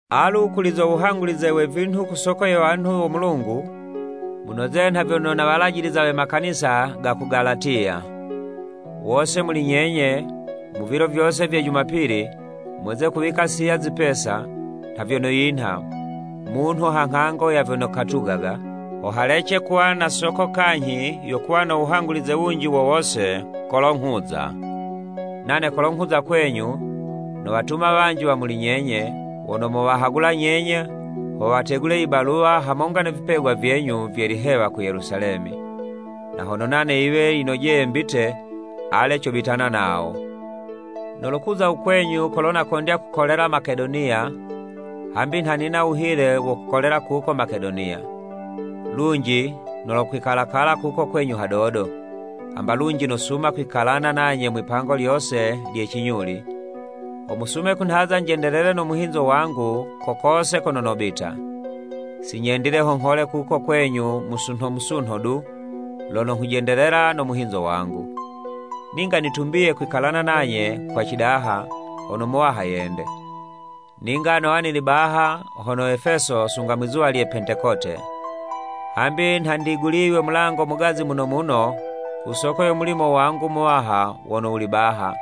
Alu, kuli zo wuhangulize we vinhu ku soko ye wanhu wo Mulungu, munoze nha vyono nawalajiliza we makanisa ga ku Galatiya. Wose muli nyenye, mu vilo vyose vye jumapili, mweze kuwika siya zipesa, nha vyono yinha, munhu ha nghango ya vyono katugaga, ho halece kuwa na soko kanyhi yo kuwa no wuhangulize wunji wo wose kolo nghuza. Nane kolo nghuza kwenyu, nowatuma wanji wa muli nyenye, wono mowahagula nyenye, ho wategule i baluwa, hamonga ne vipegwa vyenyu vye lihewa ku Yelusalemi. Na hono nane yiwe yinojeye mbite, ale cobitana nawo. Nolokuza u kwenyu kolo nakondya kukolela Makedoniya, hambi nha nina wuhile wo kukolela kuko Makedoniya. Lunji nolokwikalakala kuko kwenyu hadodo, hamba lunji nosuma kwikalana nanye mwipango lyose lye cinyuli, ho musume kunhaza njendelele no muhinzo wangu ko kose kono nobita. Sinyendile ho nghole kuko kwenyu musunho musunho du, lono nghujendelela no muhinzo wangu. Ninga nitumbiye kwikalana nanye kwa cidaha, hono u Muwaha yende. Ninga nowa nili baha hono Efeso sunga mwizuwa lye Pentekote. Hambi nha ndiguliywe mulango mugazi muno muno ku soko yo mulimo wangu muwaha wono wuli baha,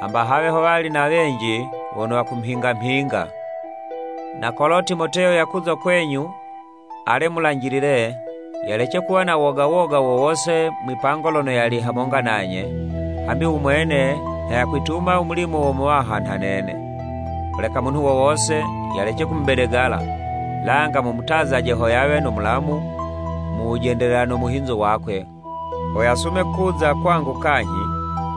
hamba hawe howali na wenji wono wakumhinga mhinga. Na kolo Timoteyo yakuza kwenyu, ale mulanjilile, yalece kuwa na woga woga wo wose mwipango lono yali hamonga nanye, hambi u mwene nha yakwituma u mulimo wo Muwaha nha nene. Holeka munhu wo wose yalece kumubedegala, langa mumutazaje ho yawe no mulamu mu wujendelela no muhinzo wakwe, ho yasume kuza kwangu kanyhi,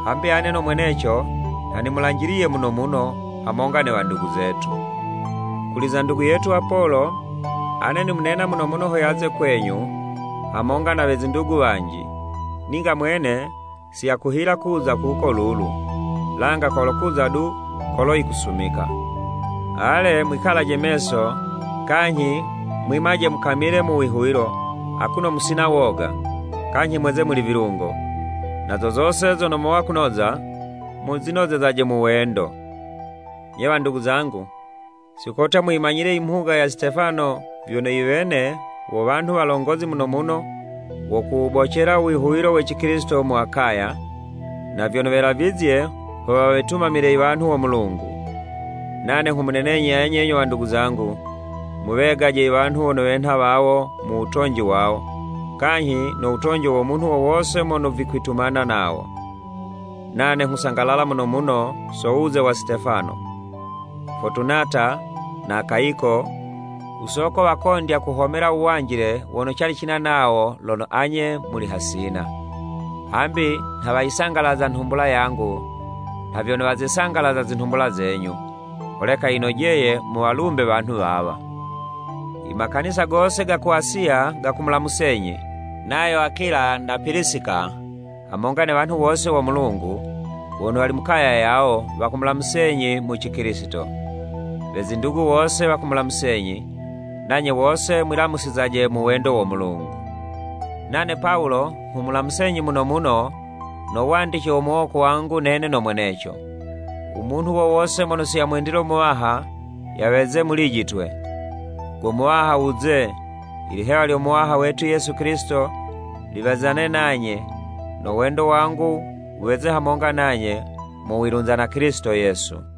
hambi ane no mweneco, nha nimulanjiliye muno muno, hamonga ne wandugu zetu. Kuli ze ndugu yetu Apolo, ane nimunena muno muno ho yaze kwenyu, hamonga na we zindugu wanji, ninga mwene si yakuhila kuza kuko lulu, langa kolokuza du kolo yikusumika. Ale, mwikalaje meso, kanyhi mwimaje mukamile mu wihuwilo, akuno musina woga, kanyhi mweze muli vilungo. Na zo zose zono mowa kunoza, muzinozezaje mu wendo. Nye wandugu zangu, si kotya muyimanyile i mhuga ya Sitefano vyono i wene, wo wanhu walongozi muno muno wo kuwubocela u wihuwilo we Cikilisito mu Akaya, na vyono welavizye ho wawetumamile i wanhu wo Mulungu. Nane nghumunenenyi anye nyo wandugu zangu, muwegaje i wanhu wono wenha wawo mu wutonji wawo, kanyhi no wutonji wo munhu wo wose mono vikwitumana nawo. Nane nghusangalala muno muno so wuze wa Sitefano, Fotunata na Akayiko ku soko wakondya kuhomela uwanjile wono cali cina nawo lono anye muli hasina. Hambi nha wayisangalaza nhumbula yangu, nha vyono wazisangalaza zinhumbula zenyu. Holeka yinojeye muwalumbe wanhu wawa. I makanisa gose ga ku Asiya gakumulamusenyi. Nayo Akula na Pilisika, hamonga ne wanhu wose wo Mulungu, wono wali mu kaya yawo, wakumulamusizenyi mu Cikilisito. We zindugu wose wakumulamusenyi. Nanye wose mwilamusizaje mu wendo wo Mulungu. Nane Pawulo nghumulamusenyi muno muno, no wandice wo muwoko wangu nene no mweneco. U munhu wo wose mono siyamwendile Muwaha, yaweze mulijitwe. Go Muwaha wuze! Ilihewa lyo Muwaha wetu Yesu Kilisito, liwezane nanye. No wendo wangu wuweze hamonga nanye, mu wilunza na Kilisito Yesu.